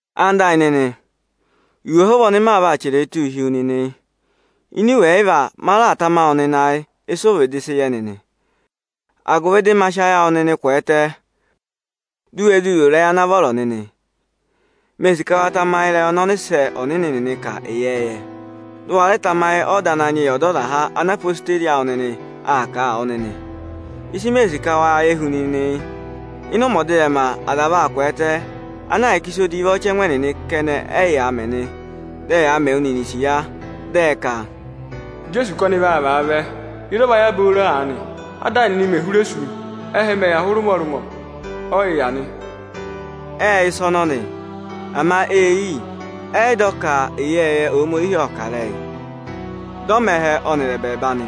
Ẹwụ nịnị ẹyịnyara amị, iwe ọhụva ọnị ma vaa chẹrẹ ẹ tụ́ụ hi wu nịnị yị. Ini iwe ẹyịva, ma raà tama wụ nịnị ayị ịsị ụ vịdị sị yẹ nịnị, agụvị dị ma zụ sị ayị awụ nịnị kwẹẹtẹ, di u we zuu ro ịrẹyị ana vọrọ nịnị. Mee sì ka wa tamayị ịrẹyị ọnị ọnịsẹ ọnịnị nịnị kà ịyẹẹyẹ. Dị ụ wa rẹ tamayị ọda Ananyị yị Ọdọzaha, ana odeyi awụ nịnị aa kà a wụ nịnị. Ịsị mee sì ka wa yẹ hu nịnị yị: Ịnị ụmẹ ọdịrẹma, aza vaa kwẹẹtẹ, ana ahịka ịsa edivi ọchẹngụ ẹnịnị kẹnẹ ẹyaa mẹ nị. Dị ẹyaa mẹ wụ nịnị isiya, dị ẹ ka: Ijeesu ka ọnị vaa vaa vẹ, ịzị ọ va yà booro aanị? Áda ayị nịnị me hụrẹ sú, ẹhẹ mẹ̀ yà hụrị ụmọrụmọ, ọ yị yà nị. Ệ yẹ ịsa ọnọnị, ama é yii, ẹ́ yị dọ ka ịyẹẹyẹ Ohomorihi ộ kà ịrẹyị, dị ọ mẹ ẹhẹ ọnịrị ẹbẹẹba nị.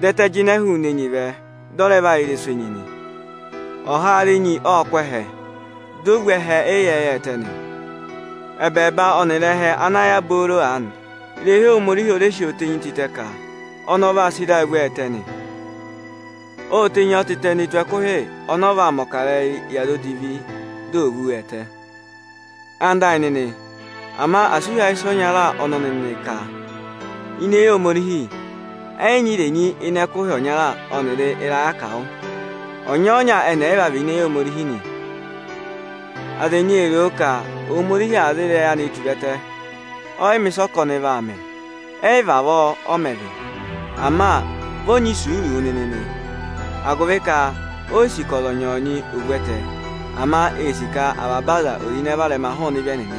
Dị ẹtẹ jịnẹ hụụnị enyi vẹ, dị ọ rẹ yà ịrẹsụ enyi nị. Ọhaara enyi ộ kụ́ ẹhẹ, dị o vú ẹhẹ ịyẹẹyẹ ẹtẹ nị. Ẹbẹẹba ọnịrị ẹhẹ ana yà booro aanị, ịrẹyị Ohomorihi ó re si tenyi ọ tịtẹ ka ọnị ọ̀ va sị ịra vú ọ ẹtẹ nị. Ô tenyi ọ tịtẹ ne tù ẹkụhị ọnị ọ vaa mẹ̀ ọkarẹyị yị aza edivi, di ò vú wa ẹtẹ. Ẹwụ nịnị ẹyịnyara amị, ama asị ụ hí ayị ịsa ọnya ọnọnị nịnị ka ini eyi Ohomorihi, ẹkụhị ọnya ọnịrị ịrayị akawụ ẹ́ yị jị ẹngụ nyee. Ọnyọọnya ẹnị ẹyịva vị̀ ini eyi Ohomorihi nị. Aza ẹnyị ee roo ka Ohomorihi aa za ịrẹyị anịị tura ẹtẹ, ọ yị mẹ̀ ịsa ọ kà a ka ọnị vaa mẹ. Ẹ́ yị vavọọ ọ mẹ vị. Ama vị ọ nyị isuuru wụ nịnị nị, agụvị ka ó yi sì ka ọzọnyị-ọzọnyị ò vú ẹtẹ, ama ee sì ka avaba aza è ro ịnẹ varẹma hụụnị ịvị ẹnịnị.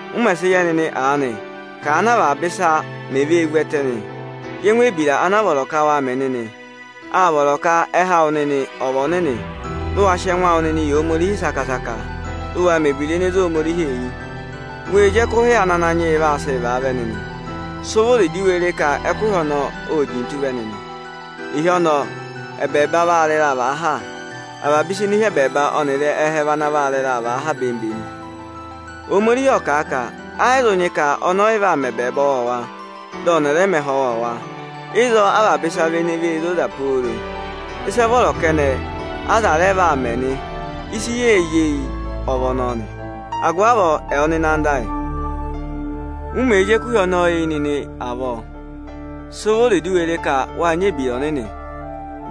Ụmẹ sị yẹ nịnị aanị ka aanị avaba ịsa mẹ̀ vee vú ẹtẹ nị, yẹ ẹngụ ebira ana vọrọ ka waa mẹ nịnị! Àa vọrọ ka ẹhẹ awụ nịnị ọ̀ vị ọnịnị, dị ụ wa sị ẹngụ awụ nịnị yị Ohomorihi saka-saka, dị ụ waa mẹ̀ ebira ene zé Ohomorihi eyi! Wee zi ẹkụhị ana Ananyị yị vaa sị vaa vẹ nịnị! Sị vụrị dị u we ré ka ẹkụhị ọnọọ óo jintu vẹ nịnị! Ịhị ọnọọ, ẹbẹẹba vaa rị ịraa vàa ha, avaba ịsa ene hi ẹbẹẹba ọnịrị ẹhẹ vị ana vaa rị ịraa ha bemi-bemi. Ohomorihi ộ kà a ka ẹ́ yị zụ nyị ọnị ọyị vaa mẹ ẹbẹẹba ọwọọwa, dị ọnị rẹ mẹ ẹhẹ ọwọọwa. Ịzọọ, avaba ịsa vị ene vee zoza pooro, ịsị ẹ vọrọ kẹnẹ aza rẹ vaa mẹ nị. Ịsị yee zí eyi ọ vị ọnọọ nị. Agụvị avọọ, ẹwụ nịnị anda ayị, u mèe zí ẹkụhị ọnọọ eyi nịnị avọọ, sị vụrị di u we re ka wáa nyị ebira ọnịnị,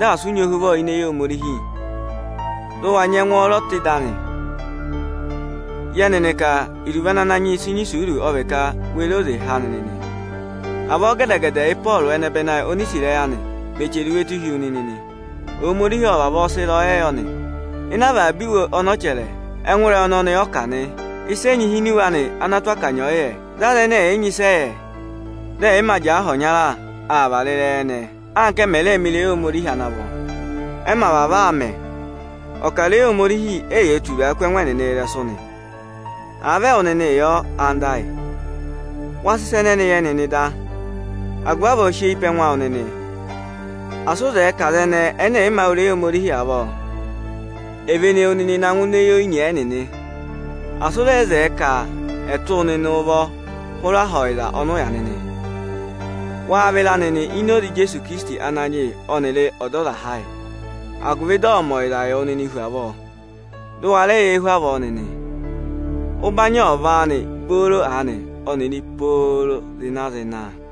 dị asị ụ nyị ohuvọ ini eyi Ohomorihi, dụ wa nyị ẹngwọọrọ tụ́ ịdị anị! Yẹ nịnị ka iruvo ana Ananyị yị sị nyị isuuru ọ vị ka we re oze há nịnị nị! Avọọ gẹdẹ-gẹdẹ Ị́pọọrụ ẹnẹbẹnị ayị oni i sí ịrẹyị anị, mẹ̀ chẹrẹ iwe tụ́ hi wu nịnị nị. Ohomorihi ọ vavọọ sị ịrẹyọyẹ yọ nị. Ịnị avaba iwe ọnị ọ chẹrẹ, ẹngụ ịrẹyị ọnọnị ọ kà nị. Ịsa ẹnyị hi ini iwe anị ana tụ́ akanya ọyị yẹ. Dị aza ẹnẹ ẹ̀yị nyị ịsị ẹ yẹ, dị ẹ̀yị mā jẹẹ aha ọnya aa vara ịrẹyị ẹnẹẹ, anka ẹ mẹ̀ rẹẹ̄ mẹ ịrẹyị Ohomorihi ana vọ. Ẹ mẹ̀ vavọọ aa mẹ, ọkarẹyị Ohomorihi éyee turaa kú ẹngụ ẹnịnị ịrẹsụ nị. Àa vị ẹwụ nịnịị yọ, anda ayị, wa sị ịsa ẹnẹnị yẹ nịnị da. Agụvị avọọ sị eyi pe ẹngụ awụ nịnị! Asị ụ zẹẹ ka aza ẹnẹẹ ẹnẹ ẹ̀yị mā wụ́ ịrẹyị Ohomorihi avọọ, è vene wu nịnị na ngụ ini eyi oyinyee ẹnịnị! Asị ụ rẹ zẹẹ ka ẹ̀ tụ́ wụ nịnị ụvọ hụrẹ aha ọyịza ọnị ụ yà nịnị! Waa vịra nịnị ini oze Ijeesu Ikirisiti Ananyị yị ọnịrị Ọdọzaha ayị, agụvị dị ọ̀ọ mẹ ọyịzaa yị wụ nịnị hu avọọ, dị ụ wa rẹẹ yẹẹ hu avọọ nịnị! Ụbanyị ọ̀ vị áanị booro aanị ọnịrị pooro zịna-zịna, Aamị.